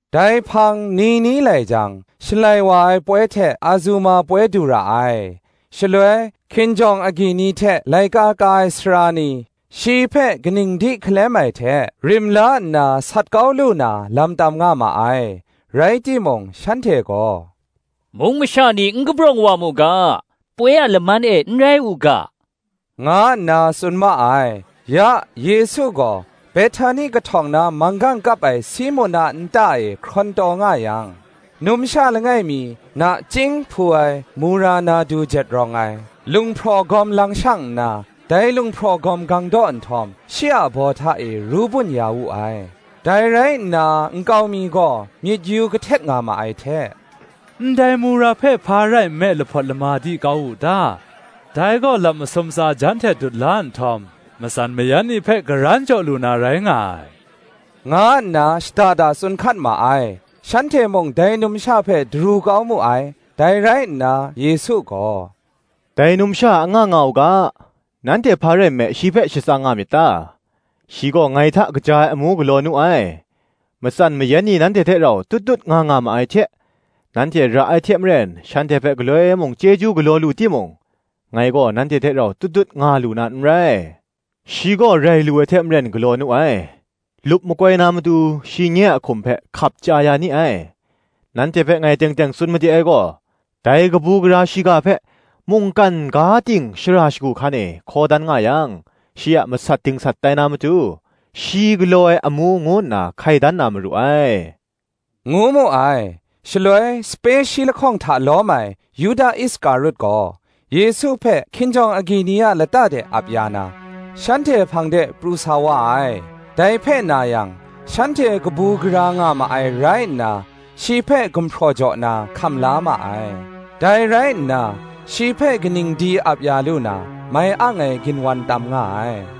Dai hpang ni ni lai jang, Shalai wa ai poi hte Azuma poi du ra ai. Shaloi, hkinjawng agyi ni hte laika ka ai sara ni shi hpe kaning di hkalem ai hte rim la nna sat kau lu na lam tam nga ma ai: rai timung shanhte gaw, “Mung masha ni n kabrawng wa mu ga, poi a laman e n rai u ga,” nga nna tsun ma ai. Ya Yesu gaw Behtani kahtawng na manggang kap ai Simun a nta e hkrawn taw nga yang, numsha langai mi nachying hpu ai mura nardu jet rawng ai lunghpraw gawm lang shang nna, dai lunghpraw gawm gang daw nhtawm, shi a baw hta e ru bun ya wu ai. Dai rai nna nkau mi gaw, myit yu kahtet nga ma ai hte, “Ndai mura hpe hpa rai nme lahpawt lama di kau wu ta? Dai gaw lap masum tsa jan hte dut la nhtawm, matsan mayan ni hpe karan jaw lu na rai nga ai,” nga nna shada da tsun hkat ma ai: shanhte mung dai numsha hpe daru kau mu ai. Dai rai nna Yesu gaw, “Dai numsha anga nga u ga; nanhte hpa rai nme shi hpe shatsang nga myit ta? Shi gaw ngai hta kaja ai amu galaw nu ai. Matsan mayan ni nanhte hte rau tut tut nga nga ma ai hte, nanhte ra ai hte maren shanhte hpe galoi mung chyeju galaw lu timung, ngai gaw nanhte hte rau tut tut nga lu na n rai. Shi gaw rai lu ai hte maren galaw nu ai; lup makoi na matu, shi nye a hkum hpe hkap chya ya ni ai. Nanhte hpe ngai teng teng tsun made ai gaw, Dai kabu gara shiga hpe mungkan ga ting shara shagu hkan e hkaw dan nga yang, shi a masat dingsat tai na matu, shi galaw ai amu ngu nna hkai dan na maru ai,” ngu mu ai. Shaloi, sape shi lahkawng hta lawm ai Yuda Iskarut gaw, Yesu hpe kinjawng agyi ni a lata de ap ya na, shanhte hpang de pru sa wa ai. Dai hpe na yang, shanhte kabu gara nga ma ai rai nna, shi hpe gumhpraw jaw na, hkam la ma ai. Dai rai nna, shi hpe kaning di ap ya lu na, mai ang ai ginwan tam nga ai.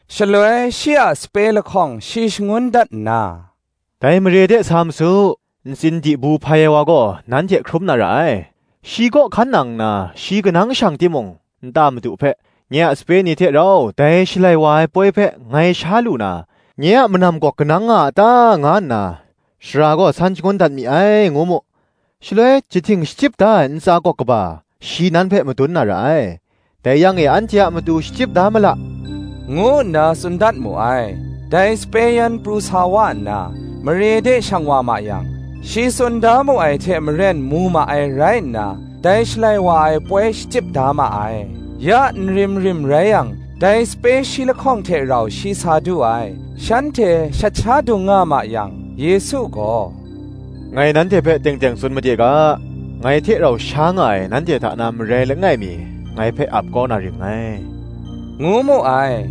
Shaloi shi a sape lahkawng shi shangun dat nna, “Dai mare de sa ma su; ntsin dibu hpai ai wa gaw nan hte hkrum na ra ai: shi kaw hkan nang nna, shi kanang shang timung, nta madu hpe, ‘Nye a sape ni hte rau dai Shalai wa ai poi hpe ngai sha lu na, nye a manam gawk kanang nga a ta?’ nga nna Sara gaw san shangun dat mi ai,” ngu mu: shaloi, jahting shachyip da ai ntsa gawk kaba shi nan hpe madun na ra ai: ‘dai yang e anhte a matu shachyip da mala,’ ngu nna tsun dat mu ai. Dai sape yan pru sa wa nna, mare de shang wa ma yang, shi tsun da mu ai hte maren, mu ma ai rai nna, dai Shalai wa ai poi shachyip da ma ai. Ya nrim rim rai yang, dai sape shi lahkawng hte rau shi sa du ai. Shanhte shat sha dung nga ma yang, Yesu gaw, “Ngai nanhte hpe teng teng tsun made ga, ngai hte rau sha nga ai, nanhte hta na marai langai mi, ngai hpe ap kau na ring ngai,” ngu mu ai.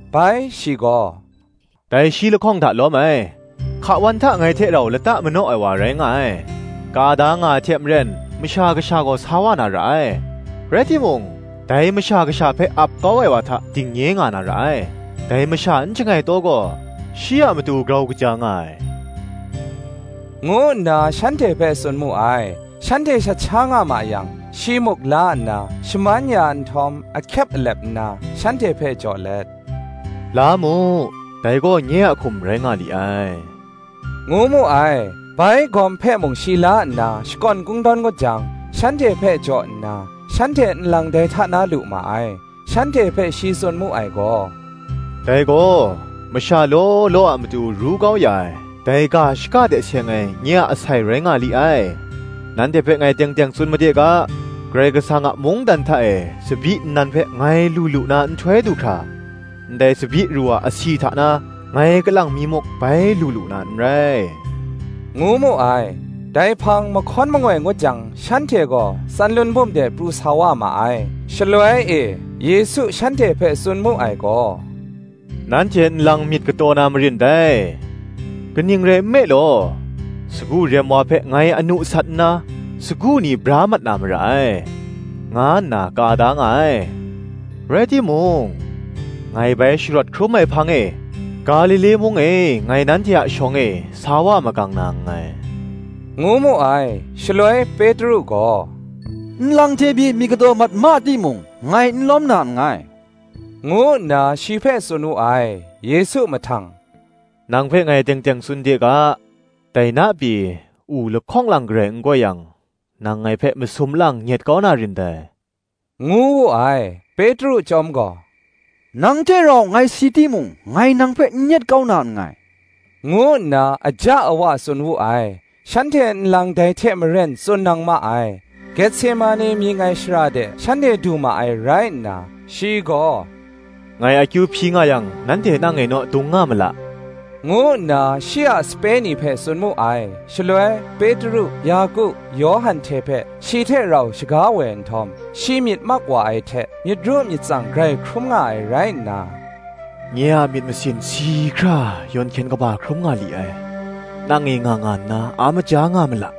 Bai shi gaw, “Dai shi lahkawng hta lawm ai, hka wan hta ngai hte rau lata manaw ai wa rai nga ai. Ka da nga ai hte maren Masha Kasha gaw sa wa na ra ai: rai timung, dai Masha Kasha hpe ap kau ai wa hta dingnye nga na ra ai; dai masha n shangai taw gaw, shi a matu grau kaja nga ai,” ngu nna shanhte hpe tsun mu ai. Shanhte shat sha nga ma yang, shi muk la nna, shaman ya nhtawm, ahkyep alep nna, shanhte hpe jaw let, “La mu, dai gaw nye a hkum rai nga li ai,” ngu mu ai. Bai, gawm hpe mung shi la nna, shakawn kungdawn ngut jang, shanhte hpe jaw nna, shanhte nlang dai hta na lu ma ai. Shanhte hpe shi tsun mu ai gaw, “Dai gaw, masha law law a matu ru kau ya ai, dai ga shaka hte seng ai, nye a asai rai nga li ai. Nanhte hpe ngai teng teng tsun made ga, Karai Kasang a mungdan hta e tsabyi nnan hpe ngai lu lu na nhtoi du hkra, ndai tsabyi ru a asi hta na, ngai kalang mi muk bai lu lu na n rai,” ngu mu ai. Dai hpang mahkawn mangoi ngut jang, shanhte gaw Tsanlun bum de pru sa wa ma ai. Shaloi e, Yesu shanhte hpe tsun mu ai gaw, “Nanhte nlang myit kataw na marin dai; kaning rai nme law, Sagu rem wa hpe ngai anu sat nna, sagu ni bra mat na mara ai, nga nna ka da nga ai: rai timung, ngai bai sharawt hkrum ai hpang e, Galile mung e ngai nanhte a shawng e, sa wa magang na nngai,” ngu mu ai. Shaloi Petru gaw, “Nlang hte pyi myit kataw mat ma timung, ngai n lawm na nngai,” ngu nna shi hpe tsun wu ai. Yesu mahtang, “Nang hpe ngai teng teng tsun de ga, Dai na pyi, u lahkawng lang garai n goi yang, nang ngai hpe masum lang nyet kau na rin dai,” ngu wu ai. Petru chyawm gaw, “Nang hte rau ngai si timung ngai nang hpe n nyet kau na nngai,” ngu nna aja awa tsun wu ai. Shanhte nlang dai hte maren tsun nang ma ai. Getsemane mying ai shara de shanhte du ma ai rai nna, shi gaw, “Ngai akyu hpyi nga yang nanhte nang e naw dung nga ma la,” ngu nna shi a sape ni hpe tsun mu ai. Shaloi, Petru, Yaku, Yawhan hte hpe shi hte rau shaga woi nhtawm, shi myit mak wa ai hte, myit ru myit tsang grai hkrum nga ai rai nna, “Nye a myit masin si hkra yawn hkyen kaba hkrum nga li ai: nang e nga nga nna, a maja nga ma la,”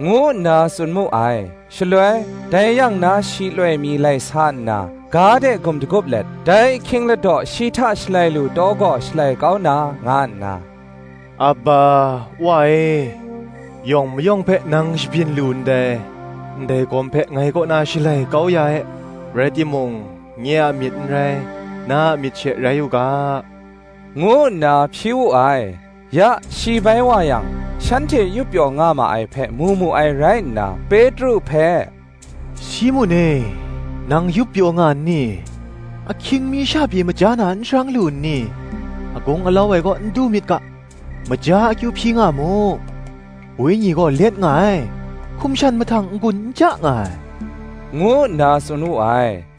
ngu nna tsun mu ai. Shaloi, dai yang na shi loi mi lai sa nna, ga de gum dagup let, dai ahkying ladaw shi hta shalai lu taw gaw shalai kau na, nga nna, “Aba, Wa e, yawng mayawng hpe nang shabyin lu ndai; ndai gawm hpe ngai kaw na shalai kau ya e; rai timung, nye a myit n rai, na a myit she rai u ga,” ngu nna hpyi wu ai. Ya, shi bai wa yang, shanhte yup pyaw nga ma ai hpe mu mu ai rai nna, “Petru hpe, Simun e, nang yup pyaw nga nni? ahkying mi sha pyi maja na n sharang lu nni? Agung alau ai kaw n du myit ga, maja, akyu hpyi nga mu: wenyi gaw let nga ai, hkum shan mahtang n-gun n ja nga ai,” ngu nna tsun wu ai.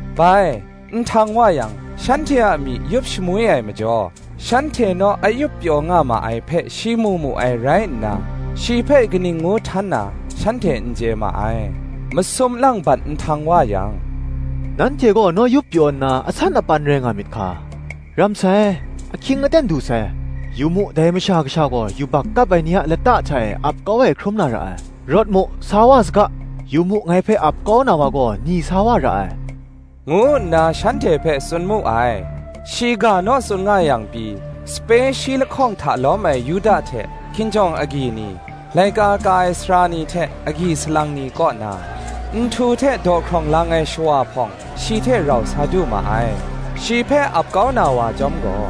Bai, nhtang wa yang, shanhte a myi yup shamwi ai majaw, shanhte naw a yup pyaw nga ma ai hpe shi mu mu ai rai nna, shi hpe kaning ngu htan na, shanhte n chye ma ai. Masum lang bat nhtang wa yang, “Nanhte gaw naw yup pyaw nna, asan apan rai nga myit hka: ram sai; ahkying aten du sai; yu mu, dai Masha Kasha gaw, yubak kap ai ni a lata hta e ap kau ai hkrum na ra ai. Rawt mu; sa wa saga: yu mu, ngai hpe ap kau na wa gaw ni sa wa ra ai,” ngu nna shanhte hpe tsun mu ai. Shi ga naw tsun nga yang pyi, sape shi lahkawng hta lawm ai Yuda hte, hkinjawng agyi ni, laika ka ai sara ni hte agyi salang ni kaw na, nhtu hte dawhkrawng lang ai shawa hpawng, shi hte rau sa du ma ai. Shi hpe ap kau na wa chyawm gaw,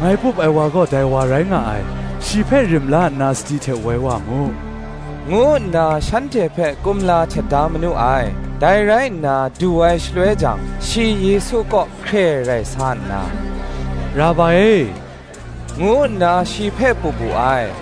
“Ngai pup ai wa gaw, dai wa rai nga ai: shi hpe rim la nna sadi hte woi wa mu,” ngu nna, shanhte hpe kumla htet da manu ai. Dai rai nna du ai shaloi jang, shi Yesu kaw hkre rai sa nna, “Rabai e,” ngu nna shi hpe pup wu ai.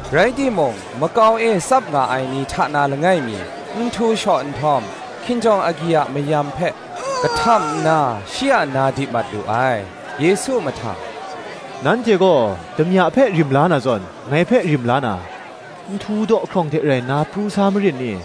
Rai timung, makau e tsap nga ai ni hta na langai mi, nhtu shaw nhtawm, hkinjawng agyi a mayam hpe kahtam nna shi a na di mat lu ai. Yesu mahtang, “Nanhte gaw, damya hpe rim la na zawn, ngai hpe rim la na, nhtu dawhkrawng hte rai nna pru sa marin ni?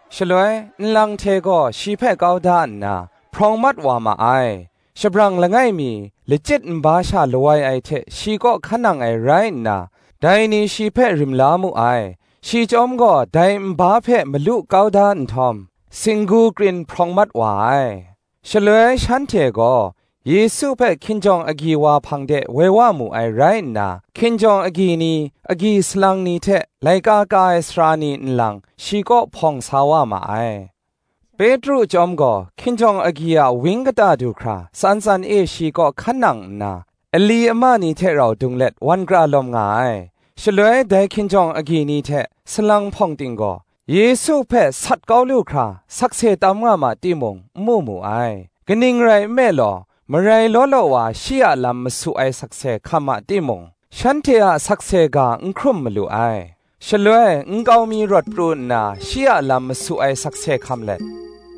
Shaloi, nlang hte gaw shi hpe kau da nna, hprawng mat wa ma ai. Shabrang langai mi, lachyit nba sha lawai ai hte shi kaw hkan nang ai rai nna, dai ni shi hpe rim la mu ai: shi chyawm gaw dai nba hpe malu kau da nhtawm, singgu krin hprawng mat wa ai. Shaloi shanhte gaw, Yesu hpe hkinjawng agyi wa hpang de, woi wa mu ai rai nna, hkinjawng agyi ni, agyi salang ni hte laika ka ai sara ni nlang, shi kaw hpawng sa wa ma ai. Petru chyawm gaw, hkinjawng agyi a wang kata du hkra, tsan tsan e shi kaw hkan nang nna, ali ama ni hte rau dung let, wan kra lawm nga ai. Shaloi dai hkinjawng agyi ni hte, salang hpawng ting gaw, Yesu hpe sat kau lu hkra, sakse tam nga ma timung, n mu mu ai: kaning rai nme law, marai law law wa shi a lam masu ai sakse hkam ma timung, shanhte a sakse ga n hkrum malu ai. Shaloi nkau mi rawt pru nna, shi a lam masu ai sakse hkam let,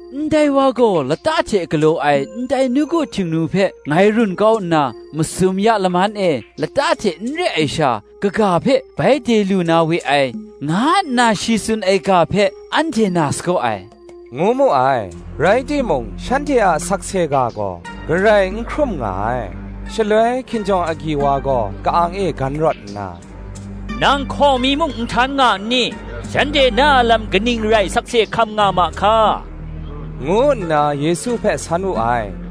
“Ndai wa gaw, Lata hte galaw ai ndai nawku Htingnu hpe ngai run kau nna, masum ya laman e, lata hte n re ai sha, kaga hpe bai de lu na we ai, nga nna shi tsun ai ga hpe anhte na sagaw ai,” ngu mu ai. Rai timung shanhte a sakse ga gaw, garai n hkrum nga ai. Shaloi hkinjawng agyi wa gaw ka-ang e gan rawt nna, “Nang hkaw mi muk n htan nga nni? shanhte na a lam kaning rai sakse hkam nga ma hka?” ngu nna Yesu hpe san wu ai.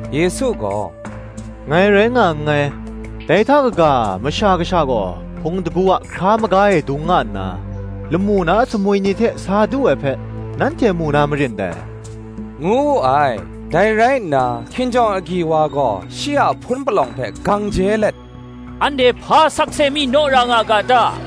Yesu gaw, “Ngai rai nga nngai; dai hta kaga, Masha Kasha gaw hpung shingkang a hkra maga e dung nga nna, lamu na sumwi ni hte sa du ai hpe, nanhte mu na marin dai,” ngu wu ai. Dai rai nna, hkinjawng agyi wa gaw shi a hpun palawng hpe gang je let, “Anhte hpa sakse mi naw ra nga ga ta?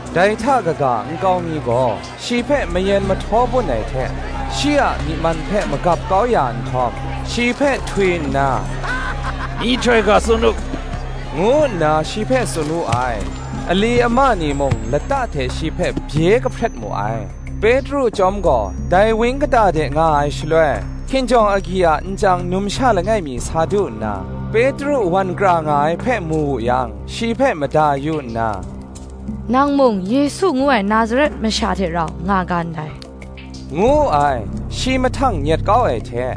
Dai hta kaga nkau mi gaw, shi hpe mayen mahtaw bun ai hte, shi a myi man hpe magap kau ya nhtawm, shi hpe htwi nna, “Myihtoi ga tsun u,” ngu nna shi hpe tsun wu ai: ali ama ni mung lata hte shi hpe bye kahpret mu ai. Petru chyawm gaw dai wang kata de nga ai shaloi, hkinjawng agyi a nchyang numsha langai mi sa du nna, Petru wan kra nga ai hpe mu wu yang, shi hpe mada yu nna, “Nang mung Yesu ngu ai Nazaret masha hte rau nga ga ndai,” ngu wu ai. Shi mahtang nyet kau ai hte,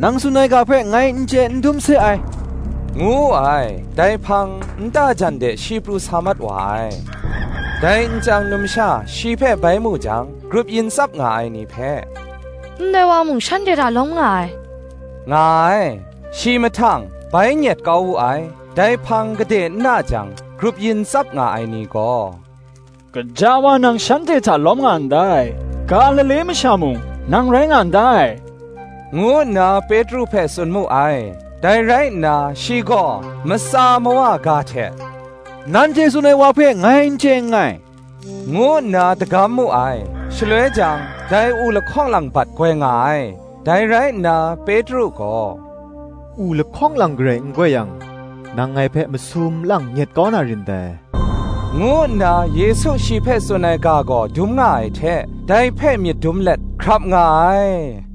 “Nang tsun ai ga hpe ngai n chye n dum se ai,” ngu wu ai: dai hpang, nta jan de shi pru sa mat wa ai. Dai nchyang numsha shi hpe bai mu jang, grup yin tsap nga ai ni hpe, “Ndai wa mung shanhte hta lawm nga ai,” nga ai. Shi mahtang, bai nyet kau wu ai. Dai hpang gade n na jang, grup yin tsap nga ai ni gaw, “Gaja wa, nang shanhte hta lawm nga ndai; Galile masha mung nang rai nga ndai,” ngu nna Petru hpe tsun mu ai. Dai rai nna, shi gaw matsa mawa ga hte, “Nanhte tsun ai wa hpe ngai n chye nngai,” ngu nna dagam mu ai. Shaloi jang, dai u lahkawng lang bat goi nga ai. Dai rai nna Petru gaw, “U lahkawng lang garai n goi yang, nang ngai hpe masum lang nyet kau na rin dai,” ngu nna Yesu shi hpe tsun ai ga hpe myit dum dat ai hte rau, hkrap nga ai.